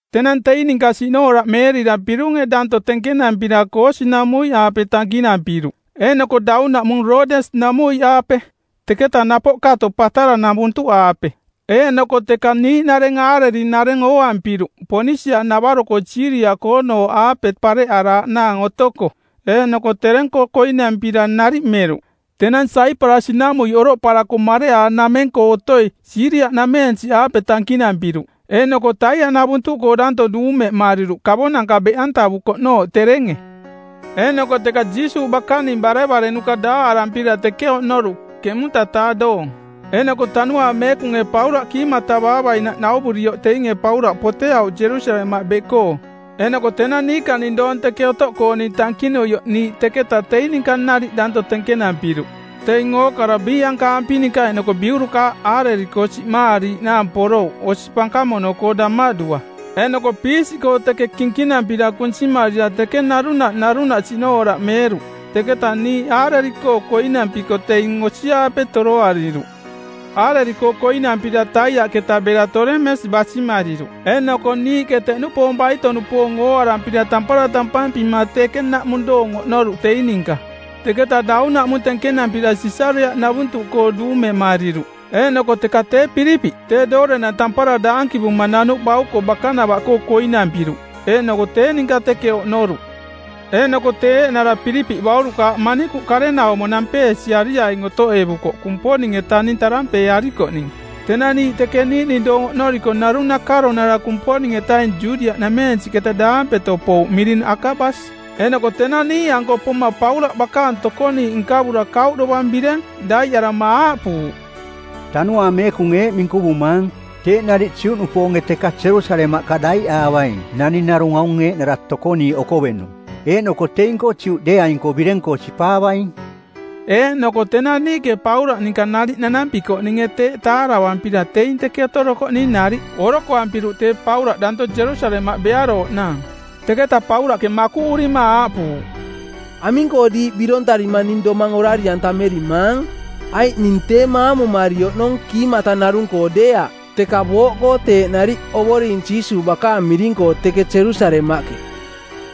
Tenang teing ninka siꞌnooraꞌmeerira pirunge danto tenkenampira Koosi-namuiꞌaape tankinampiruꞌ, eeꞌnoko daunaꞌmung Roodes-namuiꞌaape, teketa napoꞌ kato Pataraꞌnavuntuꞌaape. Eeꞌnoko teka niiꞌnareng aareri-nareng ooampiruꞌ Ponisia-navaro Siiria-koonooꞌaape pareꞌaraaꞌnaang otoko, eeꞌnoko tereng-koo koinampira nariꞌ meruꞌ. Tenang Saiparasi-namuiꞌ oroꞌparako mareꞌaanameng-koo otoi Siiria-nameensiꞌaape tankinampiruꞌ, eeꞌnoko Taiaꞌnavuntuꞌkoo daanto duumemariruꞌ kavonanka beꞌantavukoꞌnooꞌ terenge. Eeꞌnoko teka Jiisuuꞌ bakaning barevarenuka daaꞌarampira teke oꞌnoruꞌ ˜keꞌmunta-taa doong. Eeꞌnoko Tanuaang Meekunge Paulaꞌ kiimatavaavainaꞌ nauvurioꞌ teinge Paulaꞌ poteauꞌ Jerusalemaꞌ beꞌkoo. Eeꞌnoko tenang niikaning doong teke otoꞌkooning tankinuioꞌ niiꞌ teketaꞌ teing ninka nariꞌ danto tenkenampiruꞌ. Teing ookara biiꞌankaampi ninka eeꞌnoko biurukaaꞌ aareri-koo siꞌmaariiꞌnaang porouꞌ osi pankamono-koo damaꞌdua, eeꞌnoko piisiꞌkoo teke kinkinampira kunsimarira teke narunaꞌ narunaꞌ siꞌnooraꞌmeeruꞌ. Teketa niiꞌ aareri-koo koinampiko teing osi-aape toroariruꞌ. Aareri-koo koinampira Taiaꞌketa bera Tolemes basimariruꞌ eeꞌnoko niiꞌke teꞌnupoong baito-nupoong ooarampira tampara tampampima teke naꞌmung doong oꞌnoruꞌ teing ninka. Teketa daunaꞌmung tenkenampira Sisariaꞌnavuntuꞌkoo duumemariruꞌ, eeꞌnoko teka tee Pilipiꞌ, tee doorenang tampara daankivuma nanuꞌbauko, bakanava-koo koinampiruꞌ. Eeꞌnoko tee ninka teke oꞌnoruꞌ. Eeꞌnoko, tee eeꞌnara Pilipiꞌ baurukaaꞌ manikuꞌ karenaumo nampeesiariaing otoꞌevukoꞌ Kumponing-etaning tarampeearikoꞌning. Tenang niiꞌ teke niiꞌning doong oꞌnoriko narung nakaronara Kumponing-etaing Judiaꞌnameensiꞌketa daampeto pouꞌ miring Akabas. Eeꞌnoko tenang niiꞌanko poma Paulaꞌ bakaang tokoniiꞌ nkavura kauꞌ dovang bireng daiꞌarama aaꞌpuuꞌ, “Tanuaang Meekunge eeꞌ minkuvumaang: Teeꞌ nariꞌ Juꞌnupoonge teka Jerusalemaꞌka daiꞌaavaing naning narung aung eeꞌnara tokoniiꞌ okovenung, eeꞌnoko teing-koo Juꞌdeeaing-koo bireng-koo sipaavaing.” Eeꞌnoko tenang niiꞌke Paulaꞌ ninka nariꞌ nanampikoꞌninge teeꞌ taaravampira teing teke otorokoꞌning nariꞌ orokoampiruꞌ tee Paulaꞌ daanto Jerusalemaꞌ bearooꞌnaang. Teketa Paulaꞌke makuꞌurima aaꞌpuuꞌ, “Aming-koo diiꞌ birontarima ning domang orari-antamerimaang? Aiꞌ ning tee maamumari oꞌnong kiimata narung-koo deeaꞌ, teka booꞌkoo teeꞌ nariꞌ Ovoring Jiisuuꞌ bakaang miring-koo teke Jerusalemaꞌke.”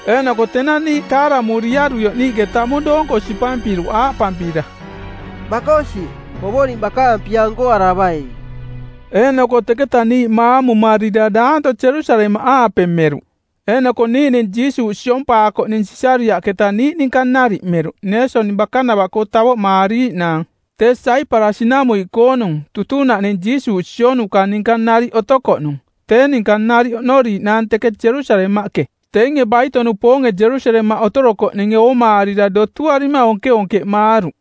Eeꞌnoko tenang niiꞌ taaramuriaruioꞌ niiꞌke tamung doonko sipampiruꞌ aaꞌpampira, “Makosi, Ovoring bakaang pia nkoaravaing.” Eeꞌnoko teketa niiꞌ maamumarira daanto Jerusalemaꞌaape meruꞌ. Eeꞌnoko niiꞌning Jiisuuꞌ siompaakoꞌning Sisariaꞌketa niiꞌ ninka nariꞌ meruꞌ Neeson bakanava-koo tavoꞌmaariiꞌnaang tee Saiparasi-namuiꞌkoonung, tutunaꞌning Jiisuuꞌ sionuka ninka nariꞌ otokoꞌnung, tee ninka nariꞌ oꞌnoriiꞌnaang teke Jerusalemaꞌke. Teinge baito-nupoonge Jerusalemaꞌ otorokoꞌninge oomaarira dotuarima onkeonkeꞌmaaruꞌ.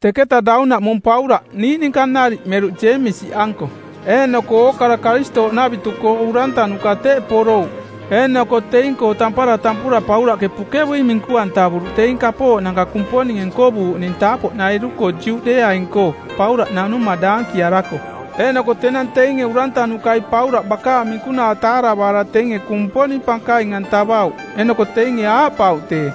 Teketa daunaꞌmung Paulaꞌ niiꞌ ninka nariꞌ meruꞌ Jeemisi-anko, eeꞌnoko ookara Karistooꞌnavitu-koo urantanuka teꞌ porouꞌ. Eeꞌnoko teing-koo tampara tampura Paulaꞌke pukevui minku-antavuruꞌ teing kapooꞌnanka Kumponinge nkovuuꞌning taapoꞌnairu-koo Juꞌdeeaing-koo Paulaꞌ nanuma daankiarako. Eeꞌnoko tenang teinge urantanukai Paulaꞌ bakaang minkunaa taaravaara teinge Kumponing pankaing-antavauꞌ. Eeꞌnoko teinge aaꞌpauꞌ tee,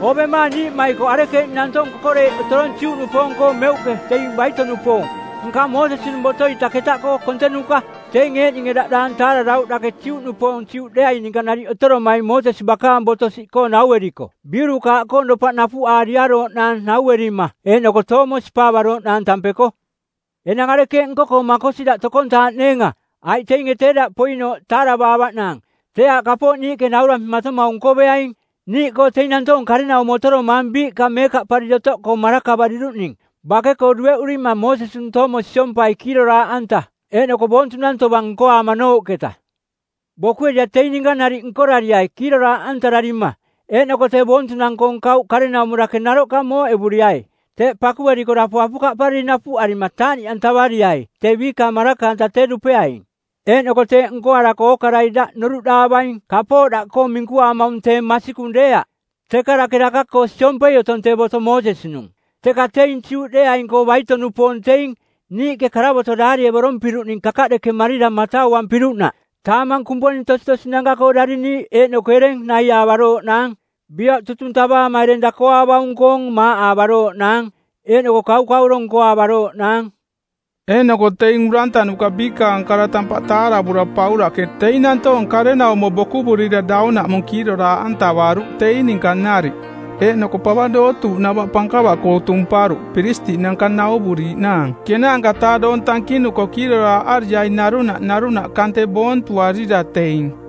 “Oovemaang niiꞌmaikoꞌ arekeeꞌning nantoong kokoreiꞌ otorong Juꞌnupoong-koo meuꞌke teing baito-nupoong, nka Moosesi-nung boto-ita ketaꞌkoo kontenuka. Teinge eeꞌninge daꞌ daang taararauꞌ dake Juꞌnupoong Juꞌdeeaing ninka nariꞌ otoromaing Moosesi bakaang boto siꞌkoo naueriko biurukaaꞌkoong dopaꞌ napuꞌaariarooꞌnaang nauerima eeꞌnoko toomo siompaavarooꞌnaang tampeko. Enang arekeeꞌ nko-koo makosi daꞌ tokontaaꞌneenga? Aiꞌ teinge tee daꞌ poinooꞌ taaravaavaꞌnaang. Tee aaꞌ kapooꞌ niiꞌke naurampimatomaung nkoveaing. Niiꞌkoo teing nantoong karenaumo otoromaang biiꞌka meekaꞌpariri otoꞌkoo marakavariruꞌning. Bake-koo dueꞌurimang Moosesi-nung toomo siompai kiiroraaꞌanta eeꞌnoko boontunang tovang nkoaamanooꞌketa. Bokuerira teing ninka nariꞌ nkorariai kiiroraaꞌantararima eeꞌnoko tee boontunang-koong kauꞌ karenaumo dake naroꞌka mooꞌevuriai. Teeꞌ pakueriko dapo apukaꞌpariri napuꞌarima taaꞌniꞌantavariai tee biikaang maraka-anta tee dupeaing. Eeꞌnoko teeꞌ nkorarako ookarai daꞌ noruꞌdaavaing kapooꞌ daꞌkoo minkuaamaung tee masikung deeaꞌ, teka dake daka-koo siompei otong tee boto Moosesi-nung. Teka teing Juꞌdeeaing-koo baito-nupoong teing, niiꞌke karavoto daarievorompiruꞌning kakaꞌdekemarira matauampiruꞌnaꞌ taamang kumponing tositosinanka-koo dariniiꞌ eeꞌnoko ereng naiaavarooꞌnaang, bioꞌ tutung tavaama ereng dakoaavaung-koong maaꞌaavarooꞌnaang, eeꞌnoko kaukauro nkoaavarooꞌnaang.” Eeꞌnoko teing urantanuka biikaang kara tampaꞌ taaravura Paulaꞌke teing nantoong karenaumo bokuvurira daunaꞌmung kiiroraaꞌantavaruꞌ teing ninka nariꞌ. Eeꞌnoko pava dootuuꞌnava pankava-koo tumparuꞌ piristiꞌnanka nauvuriiꞌnaang ˜kenaanka-taa doong tankinuko kiiroraaꞌariaing, narunaꞌ narunaꞌ kante boontuarira teing.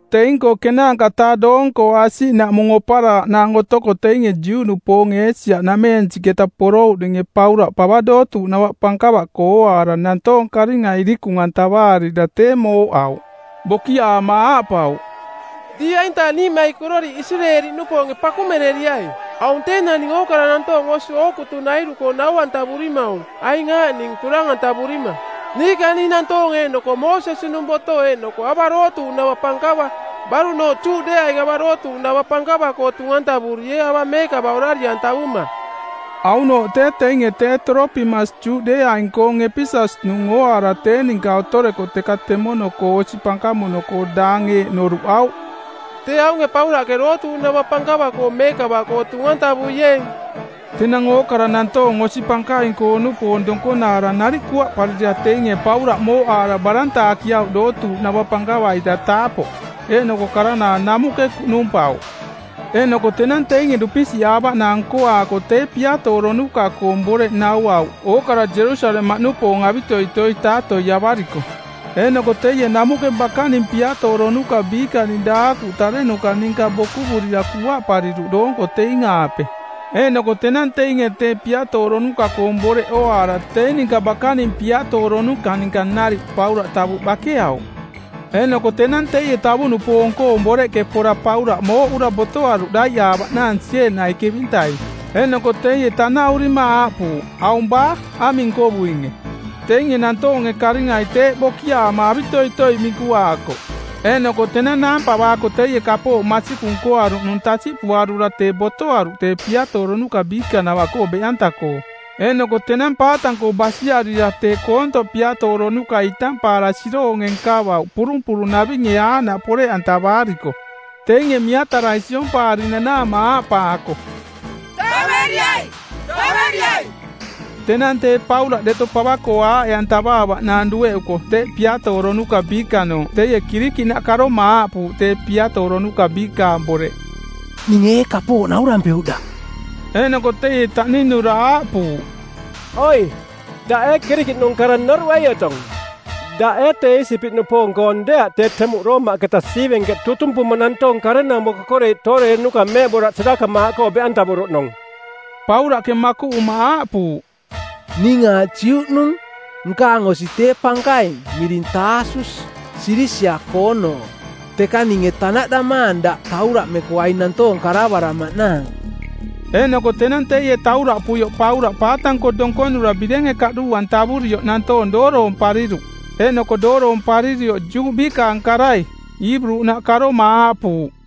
Teing-koo ˜kenaanka-taa doong-koo asiꞌnaꞌmung oparaaꞌnaang otoko teinge Juꞌnupoonge Eesia-nameensiꞌketa porouꞌninge Paulaꞌ pava dootuuꞌnava pankava-koo ooaara nantoong karinga irikung-antavaarira tee mooꞌauꞌ. Bokiaama aaꞌpauꞌ, “Diiꞌ aintaang niiꞌmaikororiꞌ Isireeli-nupoonge pakumereriai. Aung tee naning ookara nantoong osi ookutunairu-koo nau-antavurimaung aing aaꞌning turang-antavurima niikaning nantoong eeꞌnoko Moosesi-nung boto eeꞌnoko ava dootuuꞌnava pankava. Baruꞌnooꞌ Juꞌdeeaing ava dootuuꞌnava pankava-koo tung-antavuriee ava meekava orari-antavuma.” Aunooꞌ tee teinge tee Toropimas Juꞌdeeaing-koong Epeses-nung ooaara tee ninka otoreko teka temono-koo osi pankamono-koo daang eeꞌ noruꞌauꞌ, “Tee aunge Paulaꞌke dootuuꞌnava pankava-koo meekava-koo tung-antavuieeng.” Tenang ookara nantoong osi pankaing-koo-nupoong donkonaara nariꞌ kuaꞌparira teinge Paulaꞌ mooꞌaara barantaakiauꞌ dootuuꞌnava pankava-ita taapoꞌ, eeꞌnoko karanaang namuꞌke kuꞌnumpauꞌ. Eeꞌnoko tenang teinge dupisiꞌaavaꞌnaang nkoaako tee piatooronuka-koong boreꞌ nauauꞌ ookara Jerusalemaꞌnupoong avitoitoi taatoiavariko˜. Eeꞌnoko teie namuꞌke bakaning piatooronuka biikaning daakuꞌnaꞌ tarenuka ninka bokuvurira kuaꞌpariruꞌ doonko teing-aape. Eeꞌnoko tenang teinge tee piatooronuka-koong boreꞌ ooaara teing ninka bakaning piatooronuka ninka nariꞌ Paulaꞌ tavuꞌ bakeauꞌ. Eeꞌnoko tenang teie tavuꞌnupoong-koong boreꞌke pora Paulaꞌ mooꞌura botoaruꞌ daiꞌaavaꞌnaang sieenai kevintai. Eeꞌnoko teie tanaꞌurima aaꞌpuuꞌ, “Aung baa? Aming nkovuinge?” Teinge nantoonge karingai tee bokiaama avitoitoi minkuaakoꞌ. Eeꞌnoko tenang naampavaako teie kapooꞌ masikung nkoaruꞌnung tasiꞌpuarura tee botoaruꞌ tee piatooronuka biikanavaꞌkoo beꞌanta-koo. Eeꞌnoko tenang paatang-koo basiarira tee koontoꞌ piaatooronukai intampaara siroonge nkavauꞌ purumpurunavinge aaꞌnaꞌ poreꞌantavaariko, teinge miatarai siompaari nanaama aaꞌpaako, “Taveriai, taveriai!” Tenang tee Paulaꞌ deto pava-koo aaꞌe-antavaavaꞌnaang dueꞌuko teꞌ piatooronuka biikanooꞌ teie Kirikiꞌnaꞌ karoma aaꞌpuuꞌ tee piatooronuka biikaang boreꞌ, “Ninge ee kapooꞌ naurampeuꞌ daꞌ?” Eeꞌnoko teie taꞌninura aaꞌpuuꞌ, “Oi, daꞌ ee Kirikiꞌnung kara noruꞌei otong? Daꞌ ee tee Iisipiꞌnupoong-koong deeaꞌ tee temuꞌ Roomaꞌketa siivenkeꞌ tutumpuma nantoong karenaumo kokoreiꞌ tooreerenuka meeꞌboraꞌ sirakamaaꞌkoo beꞌantavuruꞌnung?” Paulaꞌke makuꞌuma aaꞌpuuꞌ, “Ning aaꞌ Juꞌnung. Nkaang osi tee pankaing, miring Taasus, Silisia-koonooꞌ. Teka ninge tanaꞌdamaang daꞌ tauraꞌmeko aing nantoong karavaramaꞌnaang.” Eeꞌnoko tenang teie tauraꞌpuioꞌ Paulaꞌ paatang-koo donkonura birenge kaꞌduu-antavurioꞌ nantoong dooroompariruꞌ. Eeꞌnoko dooroomparirioꞌ Juꞌ biikaang karai, Iiburunaꞌ, karoma aaꞌpuuꞌ,